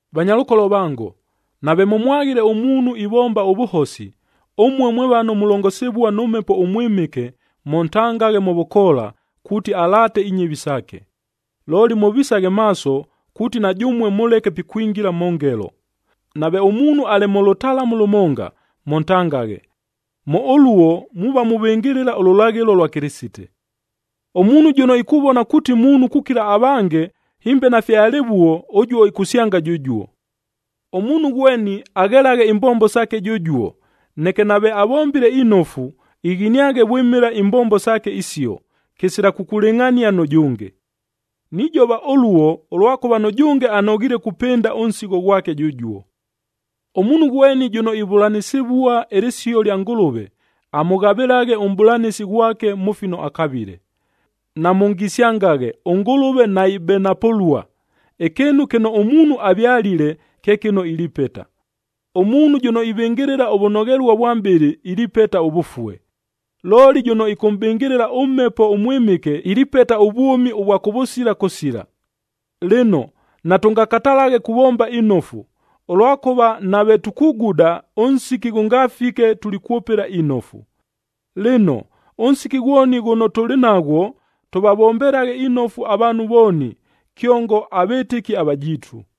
Vanyalʉkolo vango, nave mʉmwaghile ʉmuunhu ivomba ʉvʉhosi, ʉmue mwe vano mulongosivua nʉ Mhepo ʉMwɨmɨke, mʉntangaghe mʉ vʉkoola, kuuti alaate inyɨvi saake. Looli mʉvisaghe maaso, kuuti na jʉmue mʉleke pikwingila mʉ ngelo. Nave ʉmuunhu alɨ mʉ lʉtalamu lʉmonga, mʉntangaghe. Mʉ ʉluo, muuva muvɨngɨlɨla ʉlʉlaghɨlo lwa Kɨlɨsite. Ʉmuunhu jʉno ikuvona kuuti muunhu kukila avange, hɨmbe nafye alɨvuo, ʉjuo ikusyanga jʉjuo. Ʉmuunhu ghweni aghelaghe imbombo saake jʉjuo, neke nave avombile inofu, ighiniaghe vwɨmɨla imbombo saake isio, kɨsila kukulɨngʼhania nʉ jʉnge. Nijova ʉluo, ʉlwakʉva nʉjʉnge anoghiile kupɨnda ʉnsigho ghwake jʉjuo. Ʉmuunhu ghweni jʉno ivʉlanɨsɨvua ɨlɨsio lya Ngʉlʉve, amʉghavɨlaghe ʉmʼbʉlanɨsi ghwake mʉ fino akavile. Namʉngisyangaghe, ʉNgʉlʉve naibenapʉlua. Ɨkɨɨnu kɨno ʉmuunhu avyalile, kye kɨno ilipeta. Ʉmuunhu jʉno ivɨngɨlɨla ʉvʉnoghelua vwa mʼbɨlɨ, ilipeta ʉvʉfue. Looli jʉno ɨkʉmʼbɨngɨlɨla ʉMhepo ʉMwɨmɨke, ilipeta ʉvwʉmi ʉvwa kʉvʉsila kʉsila. Lɨno, natʉngakatalaghe kuvomba inofu, ʉlwakʉva nave tukuguda, ʉnsiki ghʉngafike tulikwʉpɨla inofu. Lɨno, ʉnsiki ghwoni ghʉno tʉlɨ naghwo tʉvavombelaghe inofu avaanhu vooni, kyongo avɨtɨki avajiitu.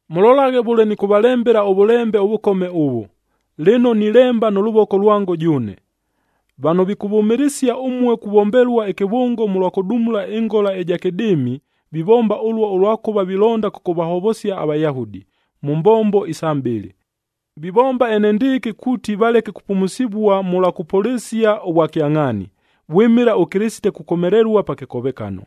Mʉlolaghe vʉle nɨkʉvalembela ʉvʉlembe ʉvʉkome ʉvʉ, lɨno nilemba nʉ lʉvoko lwango jʉʉne. Vano vikʉvʉmɨlɨsia ʉmue kuvombelua ɨkɨvʉngo mʉlwa kʉdumula ɨngola ɨja kɨdɨɨmi, vivomba ʉluo ʉlwakʉva vilonda kʉkʉvahovosia aVayahudi, mʉ mbombo isa mʼbɨlɨ. Vivomba enendɨɨkɨ kuuti valeke kupumusivua mʉlwa kʉpʉlɨsia ʉvwakyangʼhaani, vwɨmɨla ʉKɨlɨsite kukomelelua pa kɨkovekano.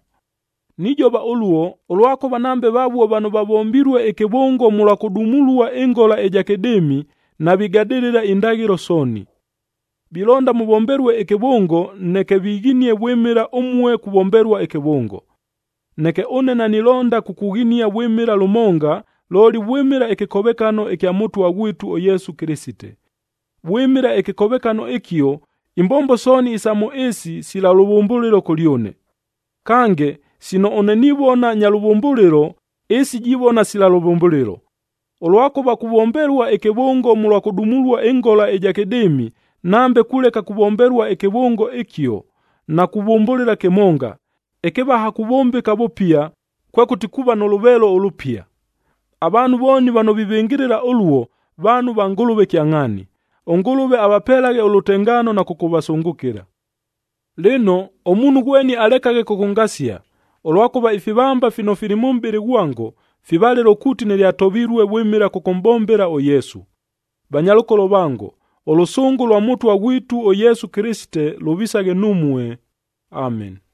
Nijova ʉluo, ʉlwakʉva nambe vavuo vano vavombilue ɨkɨvʉngo mʉlwa kʉdumulua ɨngola ɨja kɨdɨɨmi, navigadɨlɨla indaghɨlo sooni. Vilonda mʉvombelue ɨkɨvʉngo, neke vighinie vwɨmɨla ʉmue kuvombelua ɨkɨvʉngo. Neke ʉne nanilonda kukughinia vwɨmɨla lʉmonga, looli vwɨmɨla ɨkɨkovekano ɨkya Mʉtwa ghwitu ʉYesu Kɨlɨsite. Vwɨmɨla ɨkɨkovekano ɨkio, imbombo sooni isa mʉ ɨɨsi, sila lʉvʉmbʉlɨlo kʉlyʉne. Kange, sino ʉne nivona nya lʉvʉmbʉlɨlo, ɨɨsi jivona sila lʉvʉmbʉlɨlo. Ʉlwakʉva kuvombelua ɨkɨvʉngo mʉlwa kʉdumulua ɨngola ɨja kɨdɨɨmi, nambe kuleka kuvombelua ɨkɨvʉngo ɨkio, nakuvʉmbʉlɨla kɨmonga; ɨkɨvaha kuvʉmbɨka vʉpia, kwekʉti kuuva nʉ lʉveelo ʉlʉpia. Avaanhu vooni vano vivɨngɨlɨla ʉluo, vaanhu va Ngʉlʉve kyangʼhaani. ɄNgʉlʉve avapelaghe ʉlʉtengaano na kʉkʉvasʉngʉkɨla. Lɨno, ʉmuunhu ghweni alekaghe kʉkʉngasia, ʉlwakʉva ifivamba fino fili mʉ mʼbɨlɨ ghwango, fivalɨlo kuuti nɨlyatovilue vwɨmɨla kʉkʉmʼbombela ʉYesu. Vanyalʉkolo vango, ʉlʉsʉngʉ lwa Mʉtwa ghwitu ʉYesu Kɨlɨsite lʉvisaghe numue. Ameni.